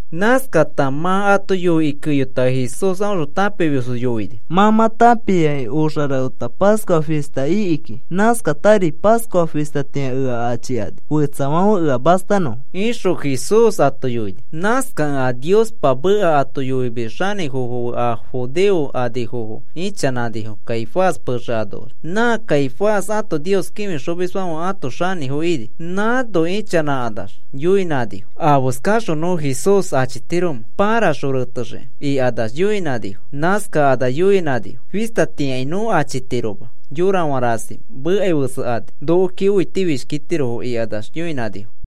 Nãskata mã ato yoikĩ keyota Jesús aõxõ tãpimisfo yoini: “Mã mã tãpiakĩ oxa rafeta Pascua fista ikiki. Nãskatari Pascua fistatĩa ea achikani fetsafãfe ea mastanõfo,” ixõ Jesús ato yoini. Nãskakẽ a Niospa meka yoimis xanĩfofo fe a judeo anifofo ichanãnifo Caifás pexe anoax. Nã Caifás ato Nios kĩfixomisfãfe ãto xanĩfo ini. Nãno ichanãkanax yoinãnifo: “¿Afeskaxõ nõ Jesús achitiromẽ paraxõ retexiki?” ikanax yoinãnifo. Nãskakanax yoinãnifo: “Fistatĩakai nõ achitiroma yorafã rasi mekai fetsekani nokoki õitifishkitirofo,” ikanax yoinãnifo.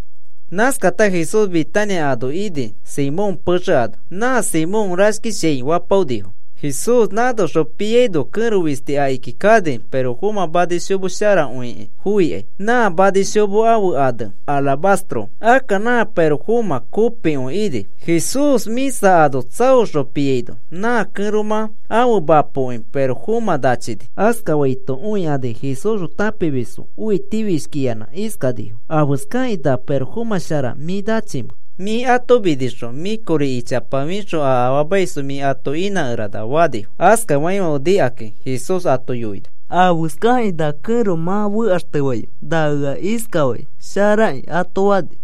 Nãskata Jesús Betania ano ini Simón pexe ano. Nã Simón “Rashkishiai” fapaonifo. Jesús nãnoxõ piaino kẽro fisti akiki kani pirofomã manishomo sharakõikĩ foikai nã manishomo ãfe ane alabastro. Akka nã pirofomã kopikõi ini. Jesús mĩsa ano tsaoxõ piaino, nã kẽromã ãfe mapoki pirofomã nachini. Askafaito õikani Jesúsxõ tãpimisfo õitifishkiyanã iskanifo: “¿Afeskakĩ nã pirofomã shara mĩ nachimẽ? Mĩ ato minixõ mĩ kori ichapa fixõ a afaamaisfo mĩ ato inãkerana,” fanifo. Askafaifãfe nikakĩ Jesús ato yoini: “¿Afeskakĩ na kẽro mã fekaxtefaimẽ? Na ea iskafai sharaki,” ato fani.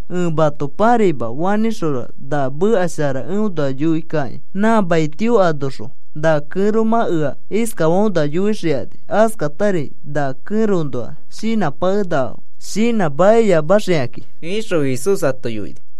Ẽ mato pãraima, fanĩxõra na meka shara eõnoa yoikakĩ nã mai tio anoxõ na kẽromã ea iskafaõnoa yoixikani. Askatari na kẽroõnoa shinãpakenakafo, shinãmakiyamaxikakĩ,” ixõ Jesús ato yoini.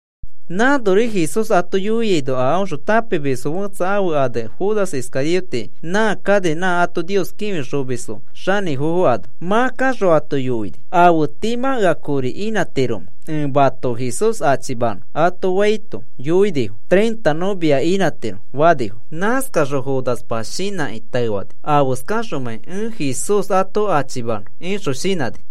Nãnori Jesús ato yoiaino a aõxõ tãpimis fetsa, ãfe ane Judas Iscariote, nã kani nã ato Nios kĩfixomis xanĩfofo ano. Mã kaxõ ato yoini: “¿Afe tii mã ea kori inãtiromẽ ẽ mato Jesús achimanõ?” ato faito yoinifo: “Treinta nõ mia inãtiro,” fanifo. Nãskaxõ Judaspa shinãkĩ taefani: “¿Afeskaxomãi ẽ Jesús ato achimanõ?” ixõ shinãni.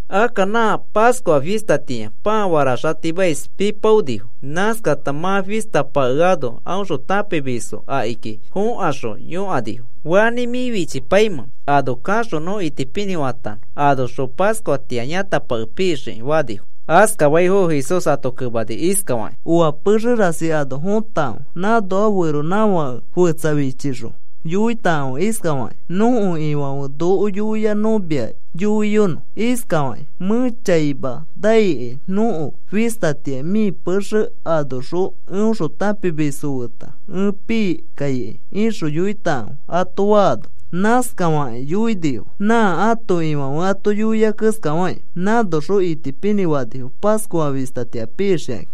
Akka nã Pascua fistatĩa pãa faraxatimais pipaonifo. Nãskata mã fista pakeano aõxõ tãpimisfo akiki fokaxõ yõkanifo: “¿Fanĩ mĩ fichipaimẽ ano kaxõ nõ itipinĩ fanõ, anoxõ Pascuatĩa yãtapake pixiki?” fanifo. Askafaifono Jesús ato kemani iskafakĩ: “Oa pexe rasi ano fotakãfe. Nãnoa feronãfake fetsa fichixõ yoitakãfe iskafakĩ: ‘Nõko Ifãfe noko yoia nõ mia yoiyonõ iskafaki: Mẽ chaima naikai. Nõko fistatĩa mĩ pexe anoxõ eõxõ tãpimisfo feta ẽ pii kaikai,’ ixõ yoitakãfe,” ato faano, nãskafakĩ yoinifo nã ãto Ifãfe ato yoia keskafakĩ. Nãnoxõ itipinĩ fanifo Pascua fistatĩa pixikakĩ.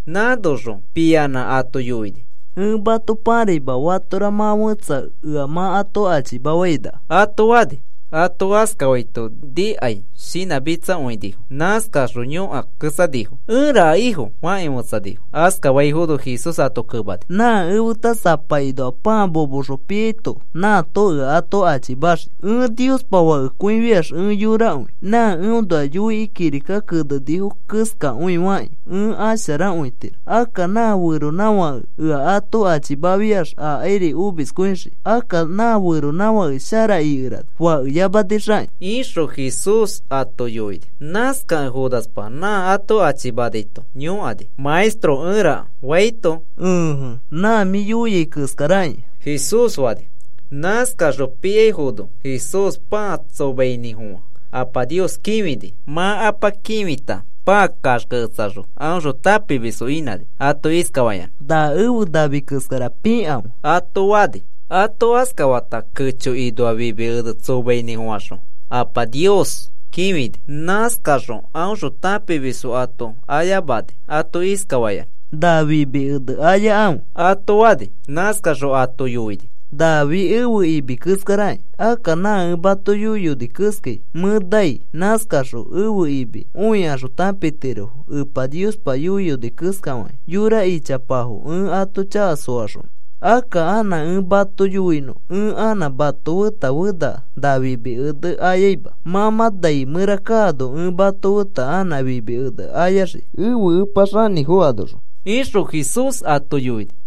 Nãnoxõ piyanã ato yoini: “Ẽ mato pãraima, fatora mã fẽtsa ea mã ato achimafainaka,” ato fani. Ato askafaito nikai shinãmitsakõinifo. Nãskaxõ yõkaketsanifo: “¿Ẽraka, Ifo?” fakĩ fetsanifo. Askafaifono Jesús ato kemani: “Nã efeta sapakinoa pãa momoxõ piaito nãato ea ato achimaxii. Ẽ Niospa Fakekõifiax ẽ yorakõi. Nã eõnoa yoikĩ kirika kenenifo keskakõi fakĩ ẽ asharakõitiro. Akka nã feronãfãke ea ato achimafiax akairi omiskõikõixii. Akka nã feronãfake shara ikerana fakeyamanixakĩ,” ixõ Jesús ato yoini. Nãskakẽ Judaspa nã ato achimanaito yõkani: “Maestro, ¿ẽraka?” faito, “Ẽje, nã mĩ yoiai keskarakĩa,” Jesús fani. Nãskakaxõ piaifono Jesús pãa tsomainĩfofã Apa Nios kĩfini. Mã Apa kĩfita pãa kaxkeketsaxõ aõxõ tãpimisfo inãni ato iskafayanã: “Na ẽfe nami keskara pikãfe,” ato fani. Ato askafata kechokinoa fimi ene tsomainĩfofãxõ Apa Nios kĩfini. Nãskaxõ aõxõ tãpimisfo ato ayamani ato iskafayanã: “Na fimi ene ayakãfe,” ato fani. Nãskaxõ ato yoini: “Nafi ẽfe imi keskaraki. Akka nã ẽ mato yoiyoni keskai mẽ nai. Nãskakaxõ ẽfe imi õikaxõ tãpitirofo Epa Niospa yoiyoni keskafakĩ yora ichapafo ẽ ato chaka soaxonõ. Akka anã ẽ mato yoinõ ẽ anã mato feta fena na fimi ene ayaima. Mã mã nai mẽra kano ẽ mato feta anã fimi ene ayaxii ẽfe Epa xanĩfo anoxõ,” ixõ Jesús ato yoini.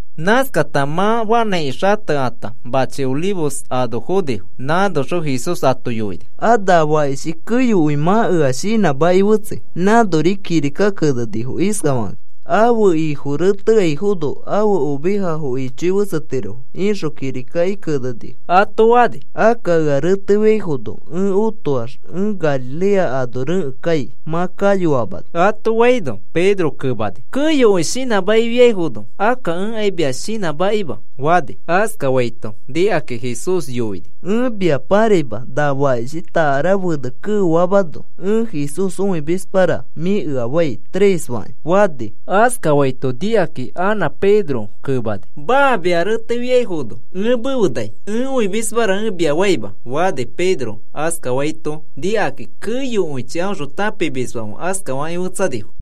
Nãskakata mã fanãiki xatekata machi Olivos ano fonifo. Nãnoxõ Jesús ato yoini: “A na fakishi keyokõi mã ea shinãmaki fetsei. Nãnori kirika kenenifo iskafakakĩ: ‘Ãfe ifo reteaifono, ãfe ovejafo ichoi fetsetirofo,’ ixõ kirika kenenifo,” ato fani. “Akka ea retefiafono ẽ otoax ẽ Galilea ano rekẽ kai mã kayoamano,” ato faino, Pedro kemani: “Keyokõi shinãmakifiaifono, akka ẽkai mia shinãmakima,” fani. Askafaito nikakĩ Jesús yoini: “Ẽ mia pãraima na fakishi takara fene keofamano, ‘Ẽ Jesús õimismara,’ mĩ ea fai tres fakĩ,” fani. Askafaito nikakĩ anã Pedro kemani: “Maa. Mia retefiaifono ẽ mefe nai. Ẽ õimismara ẽ mia faima,” fani. Pedro askafaito nikakakĩ keyokõichi aõxõ tãpimisfãfe askafakĩ fetsanifo.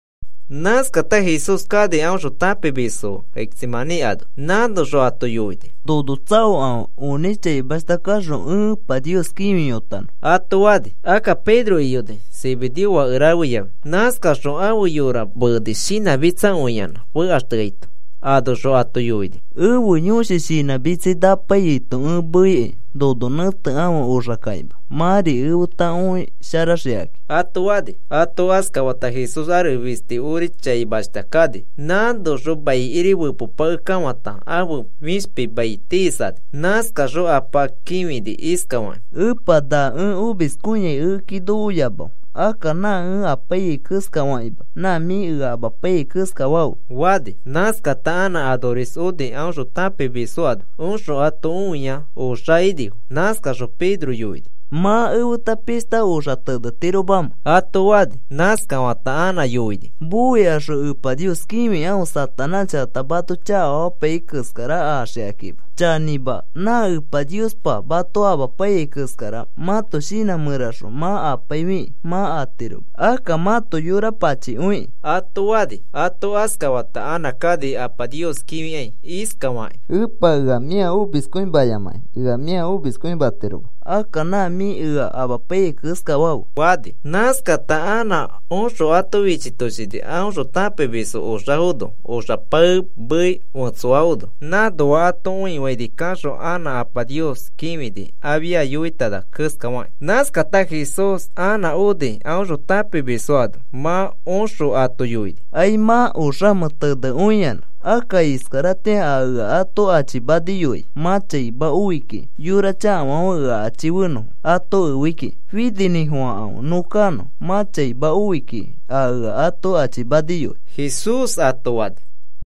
Nãskata Jesús kani aõxõ tãpimisfo fe Getsemaní ano. Nãnoxõ ato yoini: “Nono tsaokãfe onĩ chaimashta kaxõ ẽ Epa Nios kĩfiyotanõ,” ato fani. Akka Pedro iyoni, Zebedeo fake rafe yafi. Nãskaxõ ãfe yora meeni shinãmitsakõiyanã fekaxteaito. Anoxõ ato yoini: “Ẽfe yõshi shinãmitsai napaiyaito ẽ meikai. Nono nẽtekãfe oxakakima mãri efeta õisharaxikakĩ,” ato fani. Ato askafata Jesús ares fisti ori chaimashta kani. Nãnoax maikiri fepepakekafata ãfe fishpi mai tiisani. Nãskaxõ Apa kĩfini iskafakĩ: “Epa, na ẽ omiskõiai ekeki nokoyamafe. Akka nã ẽ apaiyai keskafakima. Nã mĩ ea amapaiyai keskafafe,” fani. Nãskata anã anoris oni aõxõ tãpimisfo ano. Oxõ ato õia oxafo inifo. Nãskaxõ Pedro yoini: “¿Mã efeta pishta oxa tenetiromamẽ?” ato fani. Nãskafata anã yoini: “Moikaxõ Epa Nios kĩfikãfe Satanás chakata mato chakafamapaiyai keskara axikakima. Chanĩma, nã Epa Niospa mato amapaiyai keskara mãto shinã mẽraxõ mã apaifikĩ mã atiroma. Akka mãto yora pachikõikĩ,” ato fani. Ato askafata anã kani Apa Nios kĩfikai iskafakĩ: “Epa, ea mĩa omiskõimayamakĩ ea mĩa omiskõimatiroma. Akka nã mĩ ea amapaiyai keskafafe,” fani. Nãskata anã oxõ ato fichitoshini aõxõ tãpimisfo oxafono, oxa paemei fetsoafono. Nãnoa ato õifaini kaxõ anã Apa Nios kĩfini, afia yoitana keskafakĩ. Nãskata Jesús anã oni aõxõ tãpimisfo ano. Mã oxõ ato yoini: “¿Aimã oxamẽ tenekõiyanã? Akka iskaratĩa a ea ato achimaniyoai mã chaima oi kiki. Yora chakafãfe ea achifenõfo ato efei kiki. Fininĩfofãkãfe nõ kanõ. Mã chaima oi kiki a ea ato achimaniyoai,” Jesús ato fani.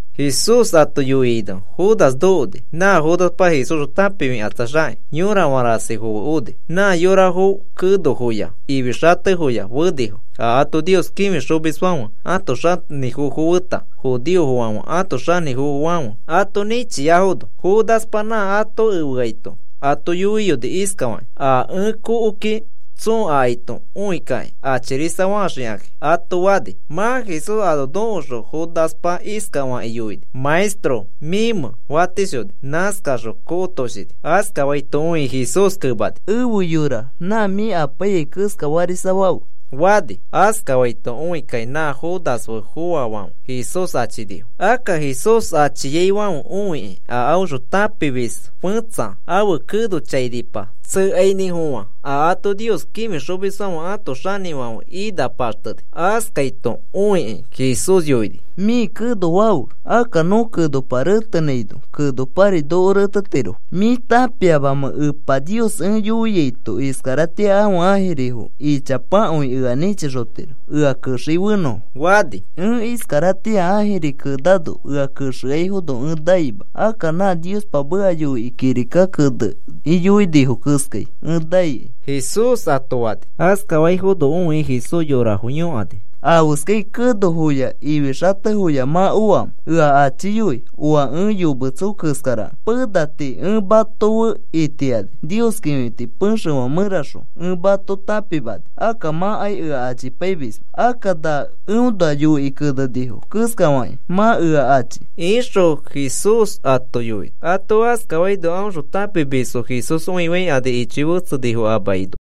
Jesús ato yoiaino Judas nokoni, nã Judaspa Jesúsxõ tãpifikatsaxakĩ, yorafã rasifo fe oni. Nã yorafo kenofoya ifi xatefoya fenifo, a ato Nios kĩfixomisfãfe ãto xanĩfofo feta judeofãfe ãto xanĩfofofãfe ato nĩchiafono. Judaspa nã ato efeaito ato yoiyoni iskafakĩ: “A ẽ kokoki tsoo akaito õikĩ achirisafaxikãki,” ato fani. Mã Jesús ano nokoxõ Judaspa iskafakĩ yoini: “Maestro, ¿mĩmẽ?” fatishoni. Nãskaxõ kokotoshini. Askafaito õikĩ Jesús kemani: “Efe yora, nã mĩ apaiyai keska farisafafe,” fani. Askafaito õikakĩ nã Judas fe foafãfe Jesús achinifo. Akka Jesús achiaifãfe õikĩ a aõxõ tãpimis fẽtsa ãfe keno chainipa tsekainĩfofã a ato Nios kĩfixomisfãfe ãto xanĩfãfe ina paxteni. Askaito õikĩ Jesús yoini: “Mĩ keno fafe. Akka nõ kenopa retenãino kenopari noko retetirofo. ¿Mĩ tãpiamamẽ Epa Nios ẽ yoiaito iskaratĩa ãfe ãjirifo ichapakõi ea nĩchixotiro ea kexei fenõfo?” fani. “Ẽ iskaratĩa ãjiri kenano ea kexeaifono ẽ naima. Akka nã Niospa meka yoikĩ kirika kenekĩ yoinifo keskai ẽ naikai,” Jesús ato fani. Askaifono õikĩ Jesús yorafo yõkani: “¿Afeskai kenofoya ifixatefoya mã oamẽ ea achiyoi oa ẽ yometso keskarakẽ? Pena tii ẽ mato fe itiani Nios kĩfiti pexefã mẽraxõ ẽ mato tãpimani, akka mãkai ea achipaimisma. Akka nã eõnoa yoikĩ kenenifo keskafakĩ mã ea achi,” ixõ Jesús ato yoini. Ato askafaino aõxõ tãpimisfo Jesús õifaikani. Ichoi fetsenifo a makinoax.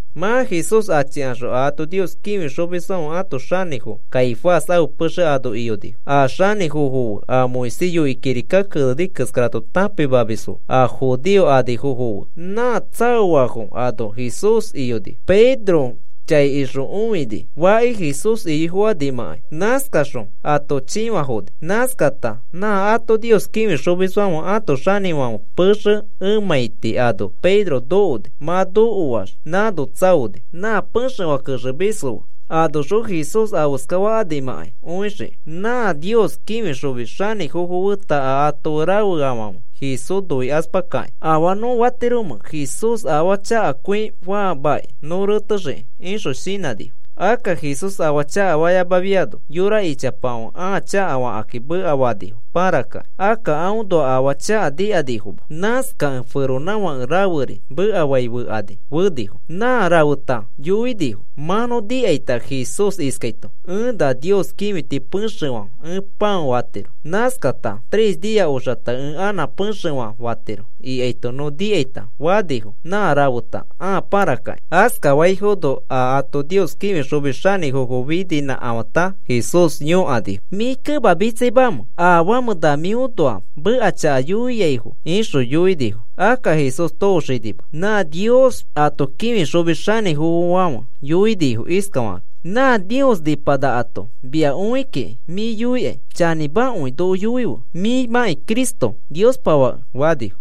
Mã Jesús achikaxõ a ato Nios kĩfixomisfãfe ãto xanĩfo Caifás ãfe pexe ano iyonifo. A xanĩfofo fe a Moisés yoikĩ kirika keneni keskara ato tãpimamisfo fe a judeo anifofo fe nã tsaoafo ano Jesús iyonifo. Pedro chai ixõ õini faki Jesús iyoi fokanimãkai. Nãskaxõ ato chĩfafoni. Nãskata nã ato Nios kĩfixomisfãfe ãto xanĩfãfe pexe emãiti ano Pedro nokoni. Mã nokoax nãno tsaoni nã pexefã kexemisfo fe anoxõ Jesús afeska fakanimãkai õixiki. Nã Nios kĩfixomis xanĩfofo feta a ato fe rafeafãfe Jesús noikaspakakĩ, “¿Afaa nõ fatiromẽ Jesús afaa chakakõi faamakĩ nõ retexiki?” ixõ shinãnifo. Akka Jesús afaa chakafayamafiano, yora ichapafãfe ãa chakafakakĩ mekafanifo parakĩ. Akka aõnoa afaa chaka nikanifoma. Nãskakẽ feronãfake raferi mekafai fekani fenifo. Nã rafeta yoinifo: “Mã nõ nikaita Jesús iskaito: ‘Ẽ na Nios kĩfiti pexefã ẽ pão fatiro. Nãskata tres nia oxata ẽ anã pexefã fatiro,’ ikaito nõ nikaita,” fanifo nã rafeta ãa parakakĩ. Askafaifono a ato Nios kĩfixomis xanĩfo fininĩkafãta Jesús yõkani: “¿Mĩ kemamitsaimamẽ afamẽ na mĩõnoa meka chaka yoiaifo?” ixõ yoini. Akka Jesús tooxinima. Nã Nios ato kĩfixomis xanĩfãfe yoini iskafakĩ: “Nã Nios nipanakato mia õi kiki mĩ yoikai chanĩmakõi, noko yoife mĩmãkĩ Cristo Niospa Fake,” fani.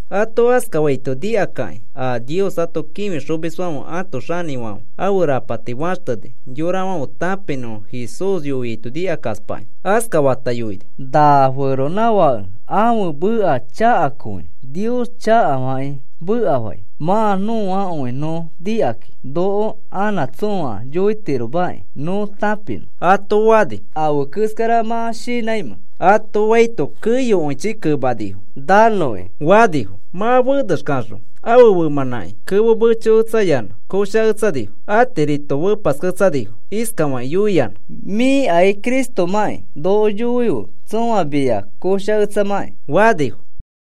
Ato askafaito nikakakĩ a Nios ato kĩfixomisfãfe ãto xanĩfãfe ãfe rapati faxteni yorafãfe tãpinõfo Jesús yoiaito nikakaspakĩ. Askafata yoini: “Na feronãfãke ãfe meka chakakõi Nios chakafakĩ mekafai. Mã nõakõi nõ nikakĩ noko anã tsõa yoitiromaki nõ tãpinõ,” ato fani. “¿Afe keskara mã shinãimẽ?” ato faito keyokõichi kemanifo: “¡Nanõki!” fanifo. Mã fenexkaxõ ãfe femãnãki kemo mechoketsayanã koshaketsanifo. Atirito fepasketsanifo. Iskafakĩ yoiyanã: “Mĩkai Cristomãkĩ, noko yoife tsõa mia koshaketsamakĩ,” fanifo.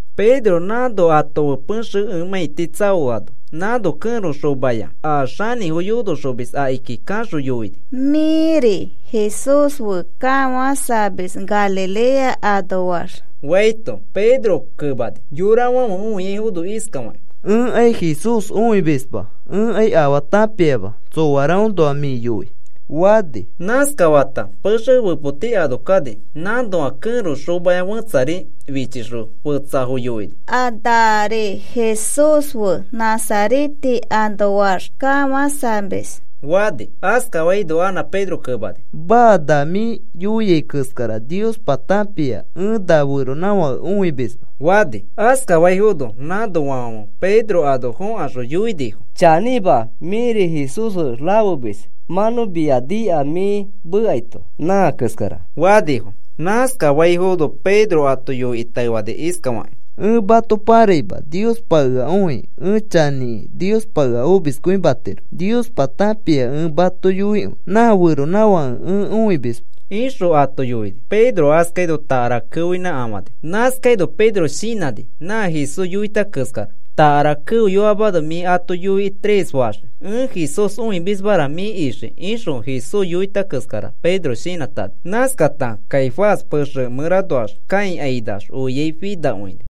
Pedro nãno ato fe pexefã emãiti tsaoano, nãno kẽro xomaya a xanĩfo yonoxomis akiki kaxõ yoini: “Mĩri Jesús fe kafãsamis Galilea anoax,” faito, Pedro kemani, yorafãfe õiaifono iskafakĩ: “Ẽkai Jesús õimisma. Ẽkai afaa tãpiama tsoaraõnoa mĩ yoi,” fani. Nãskafata pexe fepoti ano kani. Nãnoa kẽro xomaya fẽtsari fichixõ fetsafo yoini: “A nari Jesús fe Nazarete anoax kafãsamis,” fani. Askafaino anã Pedro kemani: “Maa, nã mĩ yoiai keskara Niospa tãpia ẽ na feronãfake õimisma,” fani. Nãskafaino nã anoafãfe Pedro ano fõkaxõ yoinifo: “Chanĩma, mĩri Jesús fe rafemis mã nõ mia nikai mĩ mekaito, nã keskara,” fanifo. Nãskafaifono Pedro ato yoikĩ taefani iskafakĩ: “Ẽ mato paraima, Niospa ea õi ẽ chanĩkẽ Niospa ea omiskõimatiro. Niospa tãpia ẽ mato yoikõi nã feronãfake ẽ õimisma,” ixõ ato yoini. Pedro askaino takara keoinãkafani. Nãskaino Pedro shinãni nã Jesús yoita keskara. “Takara keoyoamano mĩ ato yoikĩ tres faxii: ‘Ẽ Jesús õimismara,’ mĩ ixii,” ixõ Jesús yoita keskara Pedro shinãtani. Nãskata Caifás pexefã mẽranoax kãikainax oiai finakõini.